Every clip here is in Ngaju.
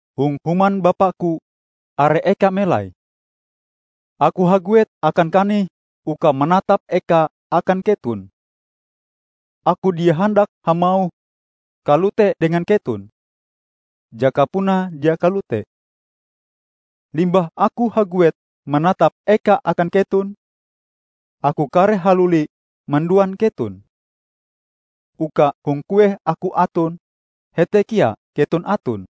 Hong human Bapa-Ku are eka melai. Aku haguet akan kanih uka manatap eka akan keton. Aku dia handak hamauh kalote dengan keton, jaka puna dia kalote. Limbah Aku haguet manatap eka akan keton, Aku kareh haluli manduan keton, uka hong kueh Aku aton, hete kea keton aton.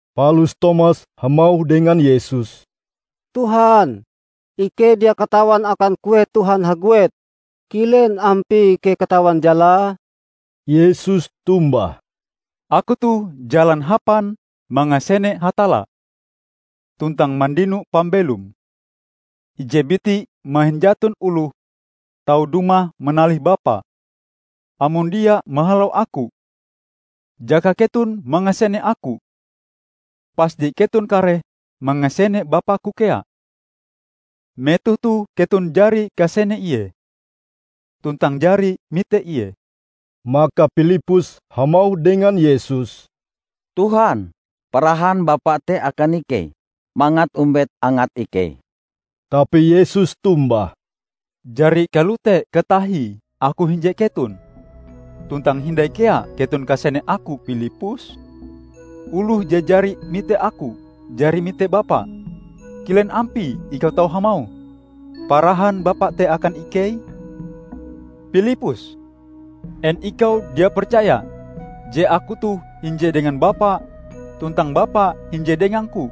Palus Tomas hamauh dengan Yesus, "Tuhan, ikei dia katawan akan kueh Tuhan haguet, kilen ampie ikei katawan jalae?" Yesus tombah, "Aku toh jalan hapan mangasene Hatalla tuntang mandino pambelom. Ije biti mahin jaton oloh tau dumah manalih Bapa, amon dia mahalau Aku. Jaka keton mangasene Aku, pasti keton kareh mangasene Bapa-Ku kea. Metoh toh keton jari kasene Ie, tuntang jari mite Ie." Maka Pilippus hamauh dengan Yesus, "Tuhan, parahan Bapa te akan ikei, mangat ombet angat ikei." Tapi Yesus tombah, "Jari kalote katahie Aku hinje keton, tuntang hindai kea keton kasene Aku, Pilippus? Oloh je jari mite Aku, jari mite Bapa. Kilen ampie ikau tau hamauh, 'Parahan Bapa te akan ikei'? Pilippus! En ikau dia percaya, je Aku toh hinje dengan Bapa tuntang Bapa hinje dengang-Ku?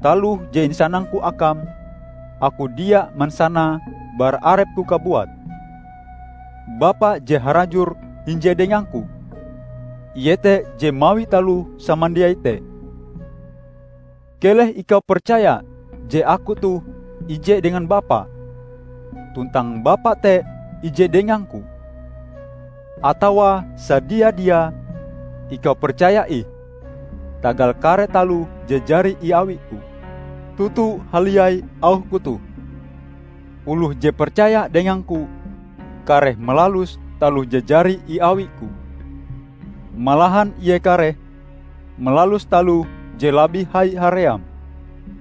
Taloh je insanang-Ku akam, Aku dia mansanae bara arep-Ku kabuat. Bapa je harajur hinje dengang-Ku, Ie te je mawi taloh samandiai te. Keleh ikau percaya je Aku toh ije dengan Bapa tuntang Bapa te ije dengang-Ku. Atawa sadia-diae, ikau percaya ih tagal kare taloh je jari iawi-Ku. Toto haliai auh-Ku toh: Oloh je percaya dengang-Ku, kareh malalus taloh je jari iawi-Ku -- malahan ie kareh malalus taloh je labih hai haream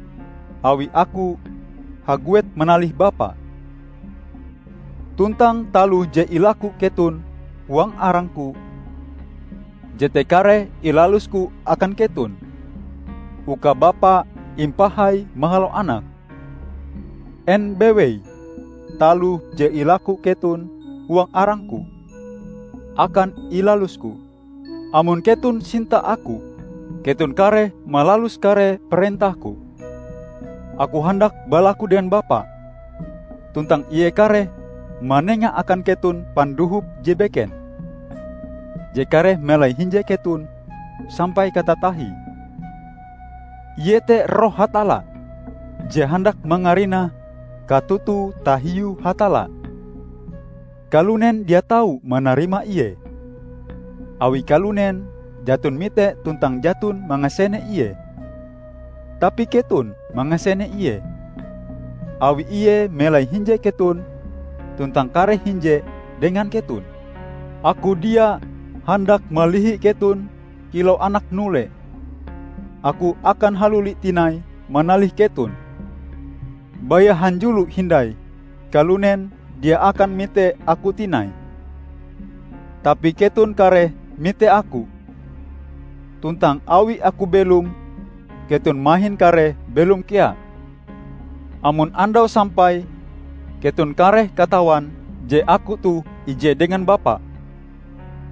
-- awi Aku haguet manalih Bapa. Tuntang taloh je ilaku keton huang arang-Ku, jete kareh ilalus-Ku akan keton, uka Bapa impahai mahalau Anak. En bewei taloh je ilaku keton huang arang-Ku, akan ilalus-Ku." "Amon keton sinta Aku, keton kareh malalus kare parentah-Ku. Aku handak balaku dengan Bapa, tuntang Ie kareh manengae akan keton Pandohop je beken, je kareh melai hinje keton sampai katatahie. Iete Roh Hatalla je handak mangarinah katoto tahiu Hatalla. Kalunen dia tau manarima Ie, awi kalunen jaton mite tuntang jaton mangasene Ie. Tapi keton mangasene Ie, awi Ie melai hinje keton tuntang kareh hinje dengan keton. Aku dia handak malihi keton kilau anak nule. Aku akan haluli tinai manalih keton. Baya hanjulo hindai kalunen dia akan mite Aku tinai. Tapi keton kareh mite Aku. Tuntang awi Aku belom, keton mahin kareh belom kea. Amon andaue sampai, keton kareh katawan je Aku toh ije dengan Bapa,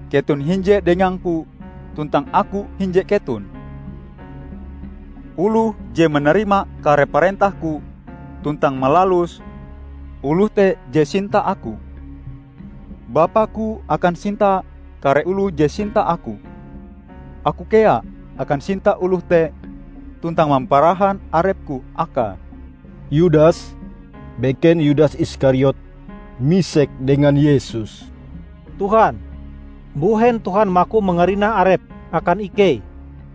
keton hinje dengang-Ku tuntang Aku hinje keton. Oloh je manarima kare parentah-Ku tuntang malaluse, oloh te je sinta Aku. Bapa-Ku akan sinta kare oloh je sinta Aku. Aku kea akan sinta oloh te tuntang mamparahan arep-Ku akae." Yudas (beken Yudas Iskariot) misek dengan Yesus, "Tuhan mbuhen Tuhan maku mangarinah arep akan ikei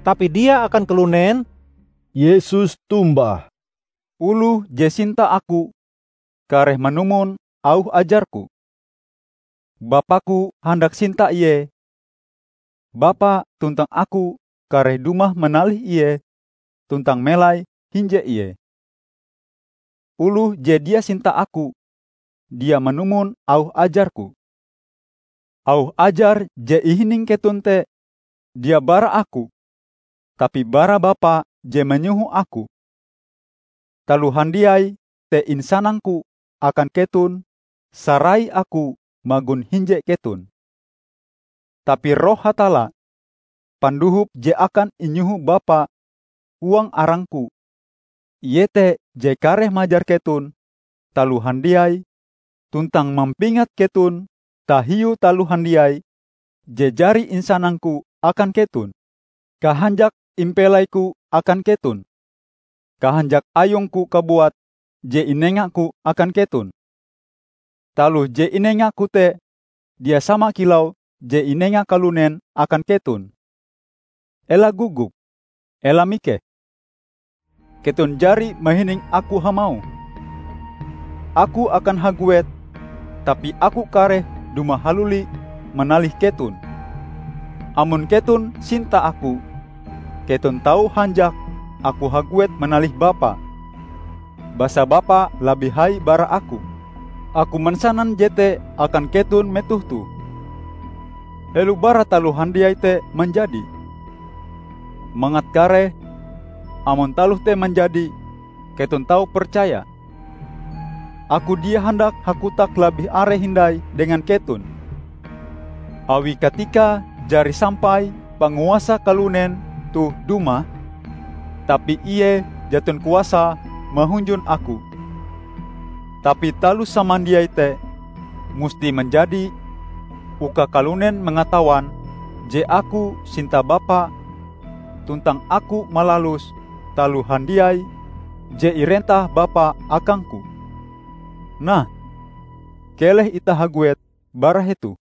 tapi dia akan kalunen?" Yesus tombah, "Oloh je sinta Aku, kareh manumon auh ajar-Ku. Bapa-Ku handak sinta ie, Bapa tuntang Aku kareh dumah manalih ie tuntang melai hinje ie. Oloh je dia sinta Aku, dia manumon auh ajar-Ku. Auh ajar je ihining keton te, dia bara Aku, tapi bara Bapa je manyoho Aku. Taloh handiai te insanang-Ku akan keton sarai Aku magon hinje keton. Tapi Roh Hatalla, Pandohop je akan inyoho Bapa huang arang-Ku, Ie te je kareh majar keton taloh handiai tuntang mampingat keton tahiu taloh handiai je jari insanang-Ku akan keton. Kahanjak impelai-Ku akan keton. Kahanjak ayung-Ku kabuat je inenga-Ku akan keton. Taloh je inenga-Ku te dia sama kilau je inenga kalunen akan keton. Ela gogop, ela mikeh. Keton jari mahining Aku hamauh, 'Aku akan haguet, tapi Aku kareh dumah haluli manalih keton'. Amon keton sinta Aku, keton tau hanjak Aku haguet manalih Bapa, basa Bapa labih hai bara Aku. Aku mansanan jete akan keton metoh toh, helo bara taloh handiai te manjadi, mangat kareh, amon taloh te manjadi, keton tau percaya. Aku dia handak hakotak labih are hindai dengan keton, awi katikae jari sampai panguasa kalunen toh dumah. Tapi ie jaton kuasae mahunjun Aku. Tapi taloh samandiai te musti manjadi uka kalunen mangatawan je Aku sinta Bapa tuntang Aku malalus taloh handiai je irentah Bapa akang-Ku. Nah, keleh itah haguet bara hetoh."